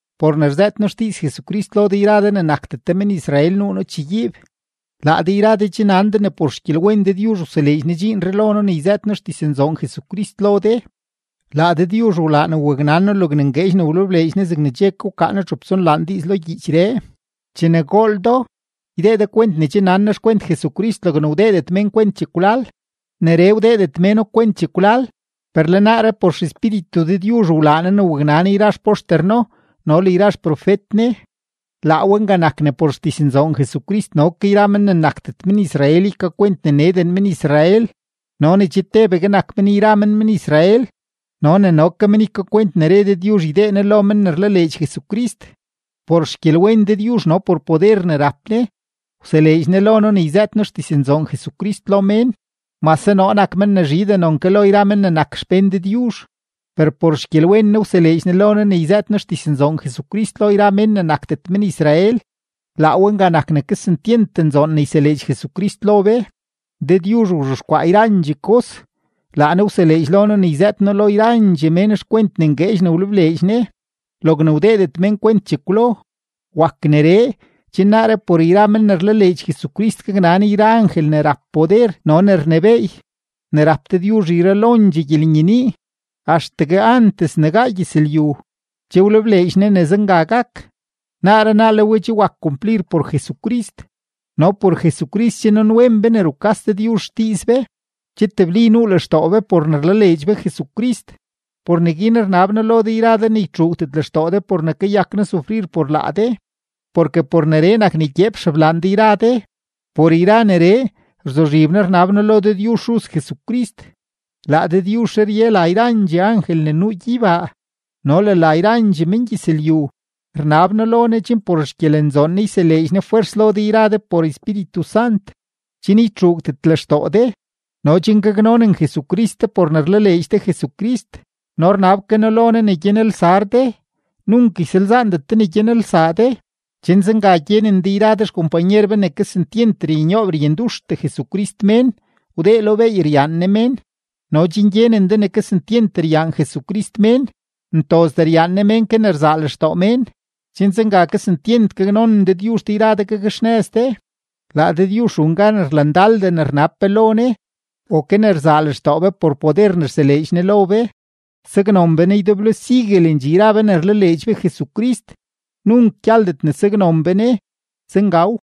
Por ne rzëët noo xdiiz Jesucrist lo de yra de ne nakdet de men-Israel nuu noo chegyiib. Laa de yra de che nan de ne por xgyelwen Dëdyuzh wseleedx Ne dxiinree lo noo ne noo yzëët xdiznzoon Jesucrist lo de. Laa Dëdyuzh wlaa ne waknan noo logne ngueedx ne wlebleedx Ne zegne che ke wkaa noo txup tsonlaan diiz lo gyiichree. Chene gool do, ydee de kwent ne che nan noo xkwent Jesucrist logne wdeedet mén kwent chekwlal. Neree wdeedet méno kwent chekwlal, per le naaree por XEspíritu Dëdyuzh wlaa Ne ne waknan yra xpoxter No no le yra xprofet Ne. Laa we nga nak ne por xdiznzoon Jesucrist no ke yra men ne nakdet men-Israel ykakwent ne neden men-Israel no ne che tebegue nak men yra men men-Israel no ne no ke men ykakwent ne re Dëdyuzh ne ydee Ne lo men ne rlaleedx Jesucrist. Por xgyelwen Dëdyuzh no por poder ne rap Ne, wseleedx Ne lo noo ne yzëët noo xdiznzoon Jesucrist lo mén. Mase noo nak men ne zhidee non ke lo yra men ne nak xpén Dëdyuzh, per por xgyelwen Ne wseleedx Ne lo noo ne yzëët noo xdiznzoon Jesucrist lo yra mén ne nakdet men-Israel, laa we nga nak ne kesentyent nzoon ne yseleedx Jesucrist lo be. Dëdyuzh wzhexkwaa yrandxee kos, laa Ne wseleedx lo noo ne yzëët noo lo yrandxee mén xkwent ne ngueedx ne wlebleedx Ne, logne wdeedet mén kwent chekwlo. Wak neree, chen naaree por yra men ne rlaleedx Jesucrist gaknan yra angel ne rap poder no ne rnebééy, ne rap Dëdyuzh yralondxee gyelenyenii. Axtegue antes ne gaa gyëzlyu, che wlebleedx Ne ne zenga gak; naaree naa le we che wak kumplir por Jesucrist, no por Jesucrist che nanwen be ne che rukas Dëdyuzh xdiiz be, che tebli nuu lextoo be por ne rlaleedx be Jesucrist. Por neguin rnab noo lo de yra de ne ytxuugdet lextoo de por ne kayak noo sufrir por laa de, porke por neree nak ne gyeep xeblaan de yra de. Por yra neree, rzuzhib noo rnab noo lo Dëdyuzh Xuz Jesucrist; laa Dëdyuzhree rye la yrandxee angel ne nuu gyeybaa no le la yrandxee mengyëzlyu. Rnab noo lo Ne chen por xgyelenzoon Ne yseleedx Ne fwers lo de yra de por Espíritu Sant, chen ytxuugdet lextoo de no chen gaknonen Jesucrist de por ne rlaleedx de Jesucrist, no rnab ke noo lo Ne ne gyanelsar de, nunk ysalzaandet de ne gyanelsaa de, chen zenga gyenen de yra de xkompanyer be ne kesentyent ryanyoob ryanduxtee Jesucrist mén, wdee lo beey ryaan Ne mén no chen gyenen de ne kesentyent ryaan Jesucrist mén, ntozdee ryaan Ne mén ke ne rzaa lextoo mén, chen zenga kesentyent gaknonen Dëdyuzh de yra de, gakxnëz de. Laa Dëdyuzh run gan rlandaldee ne rnab be lo Ne o ke ne rzaa lextoo be por poder ne rseleedx Ne lo be. Saknon be Ne ydeblo siguelendxee yra be ne rlaleedx be Jesucrist, nunk gyaldet ne saknon be Ne. Zengaw.